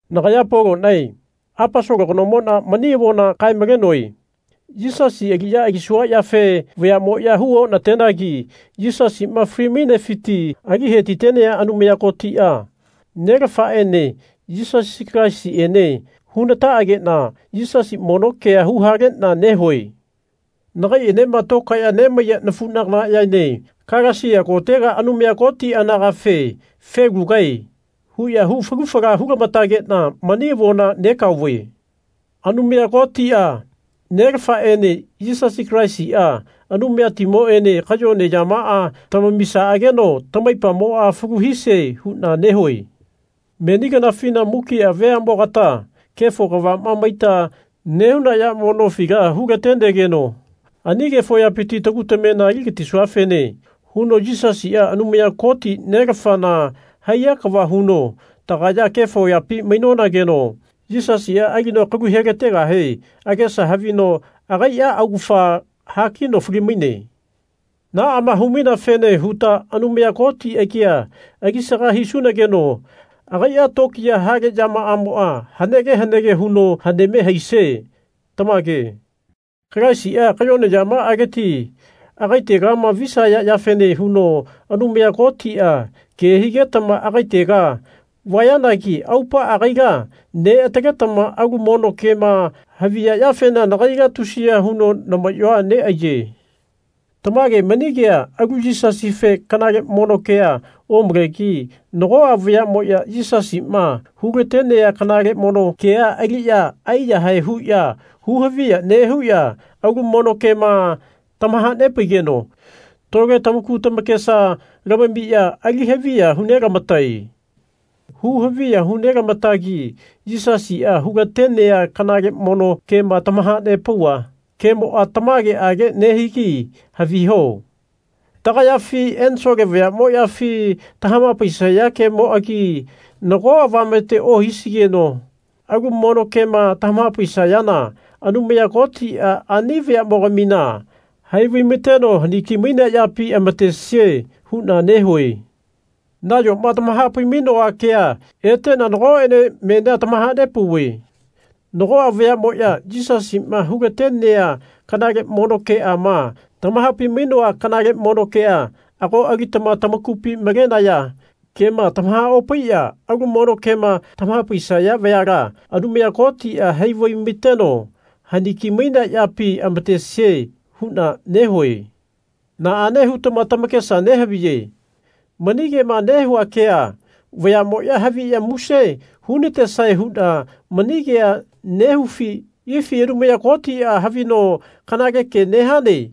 Nagaya Polonae Aposolo kanomona mani avona kae-malenoe. Yisasi aliya alisua yafe vayamoya hu onatenagi Yisasima fali-mainefiti ali hetitenea Anumaya Kotia, Nelafaene Yisasi Kalaisiene hunataagena Yisasi mono kea huhalena nehue. Nagaienema tokaeya mainaya nafunaganayaene Kalesia kotega Anumaya Koti anagafe Felugae. huya hu falu fala hulamatagena mani avona negaove. Anumaya Kotia, Nelafaene Yisasi Kalaisia, Anumayatimoene kayone yamaa tamamisaageno tamaipamoa falu hisie huna nehue. Meni kanafina mukia veanemogata kefo kavama maita nehuna yamo nofila hulatenegeno ani kefo yapiti tagu tamena aligatisuafene huno Yisasia Anumaya Koti Nelafana haiya kava huno tagaya kefo yapi mainonageno Yisasia alino kalu helategahe agesa havino agaia augafa hakino falimaine. Naama humaineafene huta Anumaya Koti agia alisaga hisunageno agaia tokiyaa hale yamaamoa hanege hanege huno haneme haisie. Tamage. Kalaisia kayone yamaaleti agaitegama visaya yafene huno Anumaya Kotia ke higetama agaitega vayanagi aupaa agaila neataletama alu mono kema haviya yafena nagaila tusiya huno namayoa neaiye. Tamage, mani kea alu Yisasife kanale mono kea omalegi nagoa vayamoya Yisasima hulatenea kanale mono kea aliya aiyahae huya huhaviya nehuya alu mono kema tamahanepaigeno tole tamaku tamakesama lamamiya ali haviya hunelamatae. Huhaviya hunelamatagi Yisasia hulatenea kanale mono kema tamahanepauva kemoa tamageage nehigi haviho. Tagayafi ensole vayamoyafi tamahapaisaya kemoagi nago avamete ohisigeno alu mono kema tamahapaisayana Anumaya Kotia ani vayamogamina hai vaimateno haniki-mainea yapi amatesie huna nehue. Nayoma tamahapai-mainoa kea etena nagoene menia tamahanepauve. Nagoa vayamoya Yisasima hulatenea kanale mono keama tamahapai-mainoa kanale mono kea ago alitama tamakupi malenaya kema tamahaopaiya alu mono kema tamahapaisaya vayala Anumaya Kotia hai vaimateno haniki-mainea yapi amatesie huna nehue. Naane hutama tamakesa nehaviye mani kema nehua kea vayamoya haviya muse hunatesae huna mani kea nehufi? Ifi Anumaya Kotia havino Kanale ke nehane.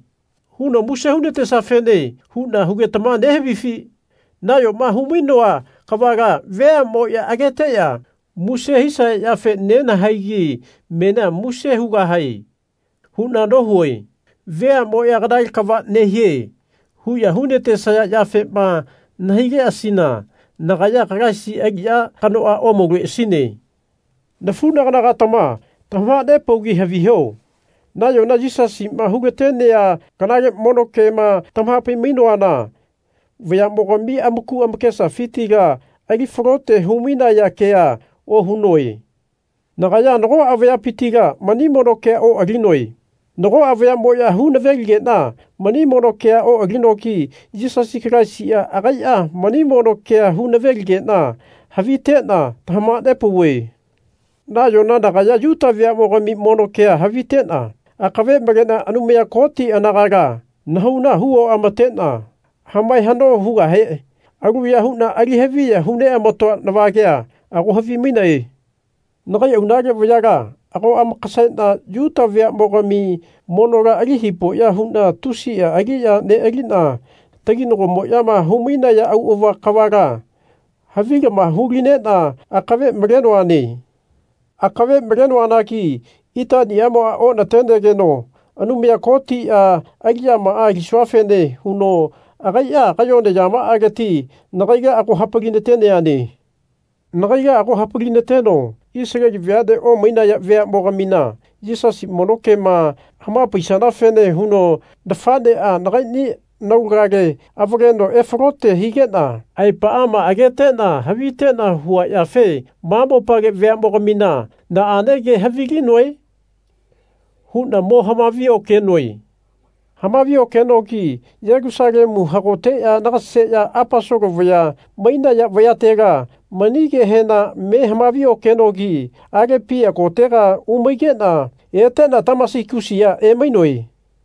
huno muse hunatesiafene huna hugetama nehavifi? Nayoma humainoa kavala veamoya ageteya muse hisaya yafe nenahaigi menia Muse hugahae. huna nohue. Veamoya Kanale kava nehie. huya hunatesaya yafema nahaileasina nagaya Kalaisi aliya kanoa omauleasine. Nafunagana-gatama tamahanepaugi haviho. Nayona Yisasima hulatenea kanale mono kema tamahapai-mainoana vayamogami amaku amakesafitila ali falote humainaya kea ohunoe. Nagaya nagoa vayapitila mani mono kea oalinoe. Nagoa vayamoya hu naveligena mani mono kea oalinogi Yisasi Kalaisia agaia mani mono kea hu naveligena havitena tamahanepauve. Nayona nagaya Yuta veamogami mono ke havitena akave malena Anumaya Koti anagala nahauna hu oamatena hamae hano hugahe aluya huna ali haviya hu neamatoa navagea ago havimainae. Nagai aunale vayala ago amakasena Yuta veamogami monola ali hipoya huna tusia aliya nealina taginagomoyama humainaya auava kavala havilama hulinena akave malenoane. Akave malenoanagi itanimoa onatenegeno Anumaya Kotia aliyamaa alisuafene huno agaia kayone yamaaleti nagaila ago hapali-nateneane. Nagaila ago hapali-nateno Isaleli veane omainaya veamogamina Yisasi mono kema hamapaisanafene huno nafanea nagaini naulagale avaleno efalote higena aepaama agetena havitena hua yafe ma mopale veamogamina Naane ke havilinoe? huna mo hamavi-okenoe. Hamavi-okenogi Yelusalemua hagoteya nagaseya Aposolo vaya mainaya vayatela mani kehena me hamavi-okenogi Alepia kotega umaigena etena Tamasigusia emainoe.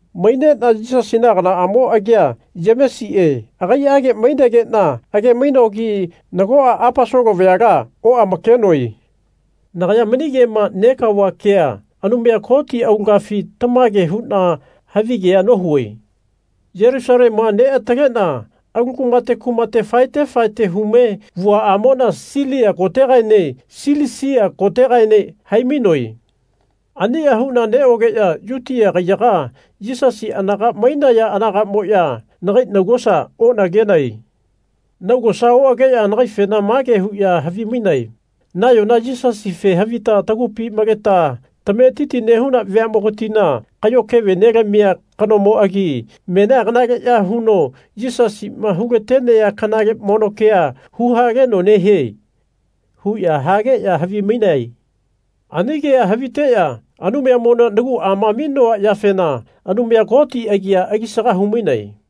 Mainena Yisasina aganaamo agia Yemesie agaiage mainegena age-mainogi nagoa Aposolo vayala oamakenoe. Nagaya mani kema negaova kea Anumaya Koti aulagafi tamage huna havigea nohue. Yelusalemua neatalena alu kumate kumate faete faete hume vuaamona Silia kotegaene Silisia kotegaene haimainoe. Ania huna neogeya Yutia kaiyaga Yisasi anaga mainaya anagamoya nagai naugosa onagenae. Naugosa oageya nagaifena mage huya havimainae Nayona Yisasife havita tagupi maleta tametiti nehuna veamogatina kayo keve nelamia kanomoagi menia kanaleya huno Yisasima hulatenea kanale mono kea huhaleno nehie. huya hageya havimainae. Ani kea haviteya Anumayamona naguama aminoa yafena Anumaya Koti agi alisaga humainae.